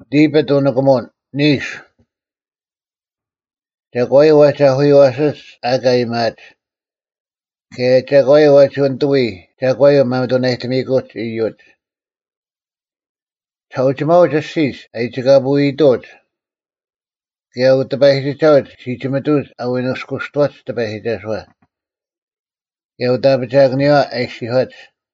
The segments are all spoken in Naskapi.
Psalm (Transfiguration Year A) 1ᒐᒂᔪᐤ ᐛᒋ ᐊᐧᑯᔪᐛᓯᒡ ᐊᑲ ᐊᔭᒥᐊᒡ: ᑭᔭ ᒐᒂᔪᐤ ᐛᒋ ᓂᑐᐎᔾ ᒐᒂᔪᐤ ᒪᒥᑐᓇᔨᑕᒥᐃᑯᒡ ᐃᔪᒡ? 2ᒋᓴᐅᒋᒪᐅᒡ ᐊᔅᒋᒡ ᐊᔨᒋᑲᐳᐎᐃᑐᐅᒡ, ᑭᔭ ᐅᑎᐸᔨᒋᒐᐅᒡ ᓯᒋᒥᑐᐅᒡ ᐊ ᐎ ᓂᔅᑯᔅᑐᐛᒡ ᑎᐸᔨᒋᒐᓱᐛ, ᑭᔭ ᐅᑦ ᐊᐱᒋᐊᑭᓂᔪᐛ ᐊ ᐃᔅᒋᔄᒡ,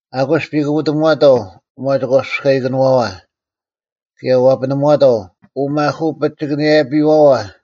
“ᐊᑯᔅ ᐱᑯᐱᑎᒺᑕᐤ ᐅᒪᒋᒂᐱᔅᑲᐃᑭᓄᐛᐛ, ᑭᔭ ᐛᐱᓂᒺᑕᐤ ᐅᒪᐧᑯᐱᒋᑭᓇᔭᐱᐛᐛ᙮”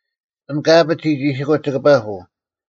ᐊᓐ ᑲ ᐊᐱᑦ ᒋᒋᒋᓯᑯᒡ ᒋᑭ ᐸᐳᐤ: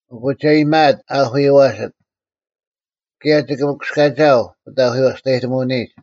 ᐊᑯ ᒐ ᐃᔨᒪᐊᑦ ᐊᐧᑯᔪᐛᓯᑦ, ᑭᔭ ᒋᑭ ᒥᑯᔅᑲᒋᐊᐤ ᐅᑦ ᐊᐧᑯᐎᔭᔅᑕᔨᑎᒧᐅᓂᒡ: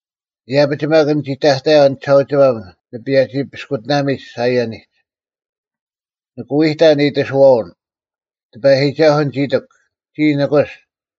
“ᐃᔭᐱᒡ ᒪᒃ ᓂᒋ ᑕᑕᔭᐤ ᓂᒋᓴᐅᒋᒪᒻ ᓂ ᐸᔭᒋ ᐱᔅᑯᑎᓇᒥᒡ ᓴᐃᔭᓂᒡ᙮” ᓂᑭ ᐎᑕᓐ ᐃᑎᓱᐛᐅᓐ: “ᑎᐸᔨᒋᒐᓱᐤ ᓂᒋ ᐃᑎᒄ, ᒋᔾ ᓂᑯᔅ;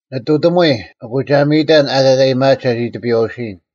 ᓂᑐᑎᒧᐎ, ᐊᑯ ᒐ ᒥᔨᑕᓐ ᐊᑲ ᐊᔭᒥᐊᒡ ᒐᒋ ᑎᐱᔨᐛᐅᓯᔨᓐ,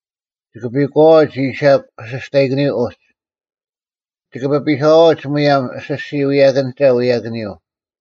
ᒋᑭ ᐱᒂᐛᐅᒡ ᐃᔨᓴᒄ ᐱᓯᔅᑕᐃᑭᓂᔪᐤ ᐅᒡ; ᒋᑭ ᐱᐱᓴᐛᐅᒡ ᒧᔭᒻ ᐊᓯᔅᒋᔾ ᐎᔭᑭᓂᒐᐤ ᐎᔭᑭᓂᔪᐤ᙮”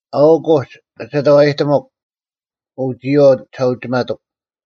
ᐊᐅᒄ ᐅᒡ ᑭᒐᑕᐛᔨᑎᒧᒄ, ᐅ ᒋᔨᐛᐤ ᒋᓴᐅᒋᒪᑐᒄ: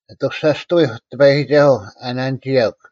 ᐊᑐᔅᒐᔅᑐᐎᐧᒄ ᑎᐸᔨᒋᒐᓱᐤ ᐊ ᓇᓂᒋᔭᒄ,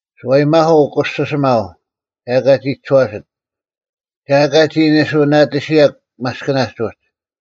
ᓱᐛᔨᒥᐧᒄ ᐅᑯᓯᓯᒪᐤ, ᒐ ᐊᑲ ᒋ ᒋᔄᓯᑦ, ᒐ ᐊᑲ ᒋ ᓂᓱᐅᓇᑎᓯᔭᒄ ᒪᔅᑭᓇᒡ ᐅᒡ,